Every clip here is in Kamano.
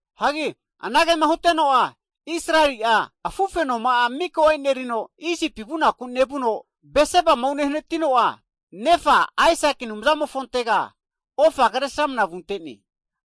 Hagi anagema huteno'a Israeli'a afufenoma'a miko enerino Isipi vunaku nevuno Bersebama unehanatino'a, nefa Aisaki Anumzamofontega ofa Kresramana vunte'ne.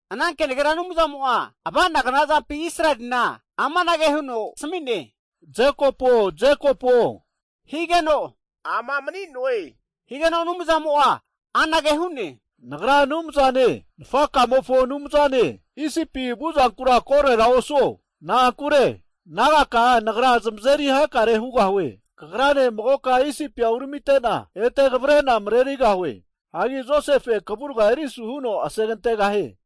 Ana kenagera Anumzamo'a ava'nagna zampi Israelina amanage huno asmi'ne, Jekopuo, Jekopuo higeno, ama mani'noe. Higeno Anumzamo'a anage hu'ne, Nagra Anumzamo'ne, nafakamofo Anumzane, Isipi vuzankura korera osuo na'ankure, nagaka'a Nagra zamazeri hakare hugahue. Kagrane magoka Isipia uramitena, ete kavre'na marerigahue. Hagi Josefe'a kavurga erisu huno asegantegahie.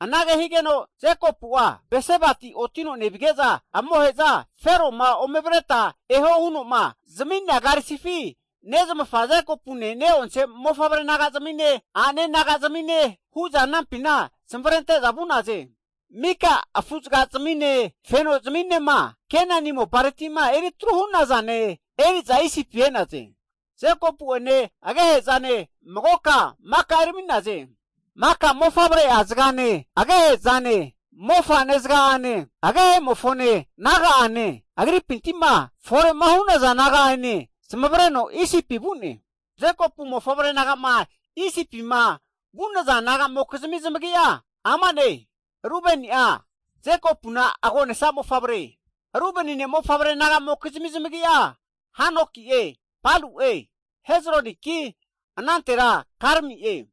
Anage higeno, Jekopu'a Bersebati otino nevige'za amohe'za Fero'ma ome avreta eho huno'ma zami'nea karisfi nezmafa Jekopune ne'onse mofavre nagazmine a'nane nagazmine, hu'za anampina zamavarente'za vu'naze. Mika afuzagazmine, fenozminema Kenani mopareti'ma eritru hu'nazane eri'za Isipi e'naze. Jekopu'ene agehe'zane magoka maka erami'naze. Maka mofavre'a zagane, agehe'zane, mofa'ne zaga'ane, agehemofone naga'ane, agripinti'ma fore hu'naza naga'ane zamavareno Isipi vu'ne. Jekopu mofavre naga'ma Isipima vu'nazana naga'mokizmi zamagi'a ama'ne, Rubeni'a Jekopuna agonesa mofavre. Rubeni ne'mofavre naga'mokizmi zamagi'a, Hanoki'e, Palu'e, Hezroniki anantera Karmi'e.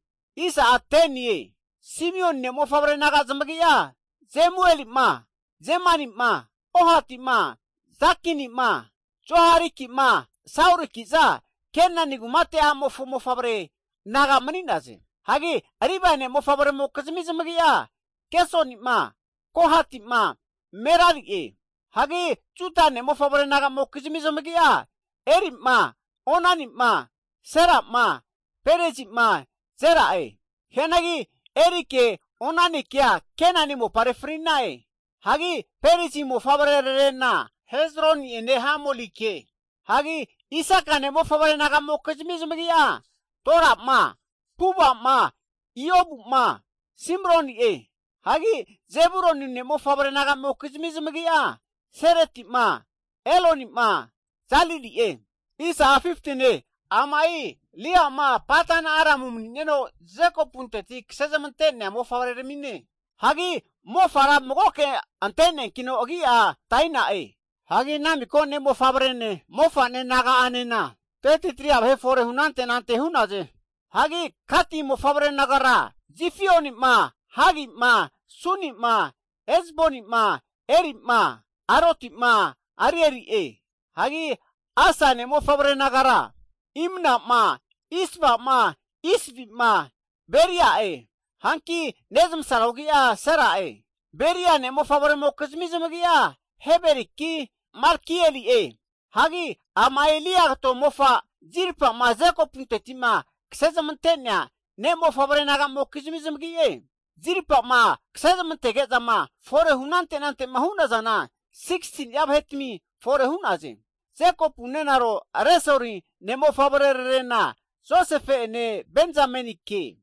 Simioni ne'mofavre naga zamagi'a Jemueli'ma, Jamini'ma, Ohati'ma, Jakini'ma, Zohariki'ma, Sauriki'za, Kenani kumate a'mofo mofavre naga mani'naze. Hagi Livae ne'mofavremokizmi zamagi'a, Gersoni'ma, Kohati'ma, Merari'e. Hagi Juda ne'mofavre naga'mokizmi zamagi'a, Eri'ma, Onani'ma, Sela'ma, Perezi'ma, Zera'e. (Hianagi Erike, Onanikea Kenani mopare fri'na'e.) Hagi Perezi mofavrerarena Hezroni'ene Hamulike. Hagi Isaka ne'mofavre naga'mokizmi zamagi'a, Tola'ma, Puva'ma, Iobu'ma, Simroni'e. Hagi Zebuluni ne'mofavre naga'amokizmi zamagi'a, Seredi'ma, Eloni'ma, Jalili'e. Ama'i Lia'ma Padan-Aram mani'neno Jekopunteti kase zmante'nea mofavreramine. Hagi mofara magoke anteneankino agi'a Daina'e. Hagi ana miko ne'mofavrene, mofa'ne naga'anena 33'a vahe forehu anante anante hu'naze. Hagi Gati mofavre nagara, Zifioni'ma, Hagi'ma, Suni'ma, Ezboni'ma, Eri'ma, Arodi'ma, Areli'e. Hagi Asa ne'mofavre nagara, Imna'ma, Isva'ma, Isvi'ma, Beria'e. Hanki nezmasaro agi'a Sera'e. Beria ne'mofavremokizni zanagi'a, Heberiki, Malkieli'e. Hagi ama'i Lia kato mofa Zilpa'ma Jekopunteti'ma kasezmante'nea ne'mofavre naga'mokizmi zamagi'e. Zilpama kasezmantege'zama fore hu anante anante'ma hu'nazana 16ni'a vahetami fore hu'naze. Jekopu nenaro Resoli ne'mofavrerarena Josefe'ene, Benzamenike.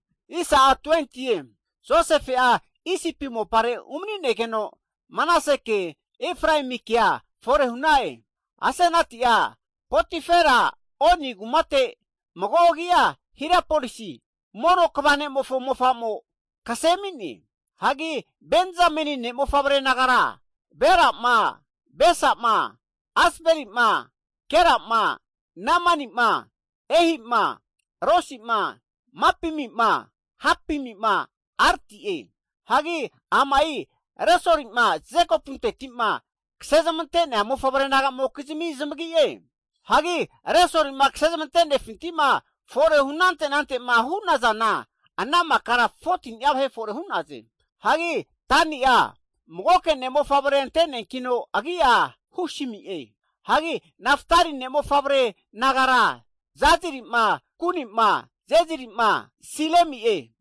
Josefe'a Isipi mopare umani'negeno Manaseke, Efraemikea fore hu'na'e. Asenati'a Potifera Oni kumate (mago agi'a Heliopolis) mono kva ne'mofo mofa'mo, kase ami'ne. Hagi Benzameni ne'mofavre nagara, Bela'ma Besa'ma, Asbeli'ma, Gera'ma, Namani'ma, Ehi'ma, Rosi'ma, Mapimi'ma, Hapimi'ma, Ardi'e. Hagi ama'i Resoli'ma Jekopunteti'ma kase zamante'nea mofavre nagamokizmi zamagi'e. Hagi Resolima kasezmante'nefinti'ma fore hu anante anante'ma hu'nazana ana makara 14ni'a vahe fore hu'naze. Hagi Dani'a magoke ne'mofavrea ante'neankino agi'a Husimi'e. Hagi Naftali ne'mofavre nagara, Jazili'ma, Guni'ma, Jezeri'ma, Silemi'e.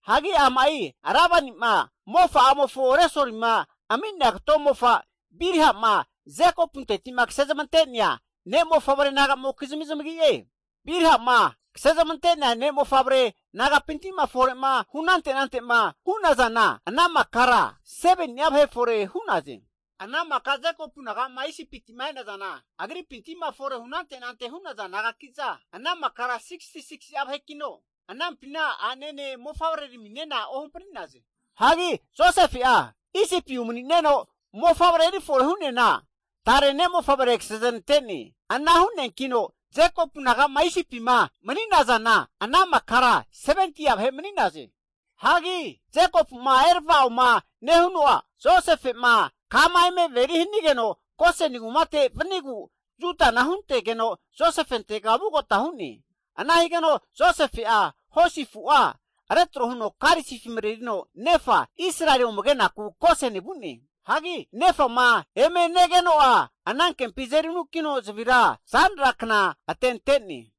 Hagi ama'i Lebani'ma mofa'amofo Resoli'ma ami'nea kato mofa Bilha'ma Jekopunteti'ma kasezmante'nea ne'mofavre naga'mokizmi zamagi'e. Bilha'ma kasezmante'nea mofavre naga'pinti'ma fore'ma hu anante anante'ma hu'nazana ana makara 7ni''a vahe fore hu'naze. Ana maka Jekopu naga'ma Isipima e'nazana, agri'pintima fore hunante anante hu'naza nagaki'za, ana makara 66'a vahekino, anampina a'nene mofavreraminena ohampri'naze. Hagi Josefe'a Isipi umani'neno mofavre erifore hu'neana, tare ne'mofavre kase zanante'ne. Ana hu'neankino Jekopu naga'ma Isipima mani'nazana ana makara 70'a vahe mani'naze. Hagi Jekopu'ma eravaoma nehuno'a, Josefe'ma kama eme averi hanigeno Goseni kumate'ma vanigu, Judana huntegeno Josefentega vugota hu'ne. Ana higeno Josefe'a hosi afu'a retro huno karisifi marerino nefa Israeli ome kenaku Goseni vu'ne. Hagi nefama eme negeno'a, anankempi azeri anukino zavira zanra kna atente'ne.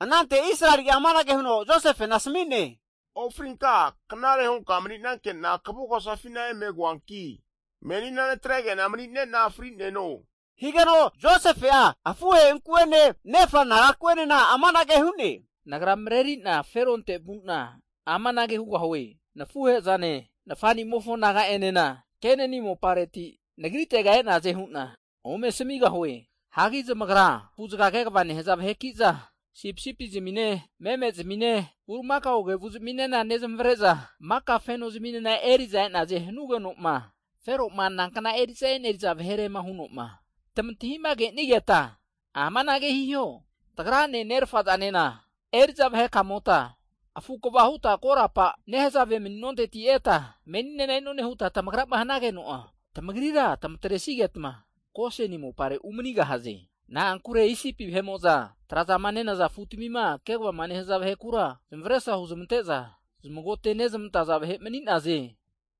Anante, Israeli'a amanage huno Josefena asmi'ne, Ofrinka knare hunka mani'nanke'na kvugosafina eme koanki menina natrege'na mani'nena fri'neno. Higeno Josefe'a afuhe'inku'ene nefa nagaku'enena amanage hu'ne, Nagra mareri'na Feronte vu'na amanage hugahue, Nafuhe'zane, nafa'nimofo naga'enena, Kenani mopareti nagritega e'naze hu'na ome asmigahue. Hagi zamagra afuzaga kva nehaza vaheki'za, sipisipizmine, memezmine, bulimakao kevuzmine nezmavre'za, maka feno zaminena eri'za e'naze, hanugeno'ma Fero'ma nankna eri'za eneriza vahere huno'ma tamantahima kenigeta, amanage hiho, Tagrane nerafa zanena eri'za vahe kamota, afu' kva huta korapa nehazave mani'nonte eta meninena e'none huta tamagrama hanageno'a, tamagrira tamatresigetma Goseni mopare umanigahaze. Na'ankure Isipi vahe'mo'za trazama nenaza afutamima kegavama nehaza vahekura, zamesra huzmante'za zamagote'nezmantaza vahe mani'naze.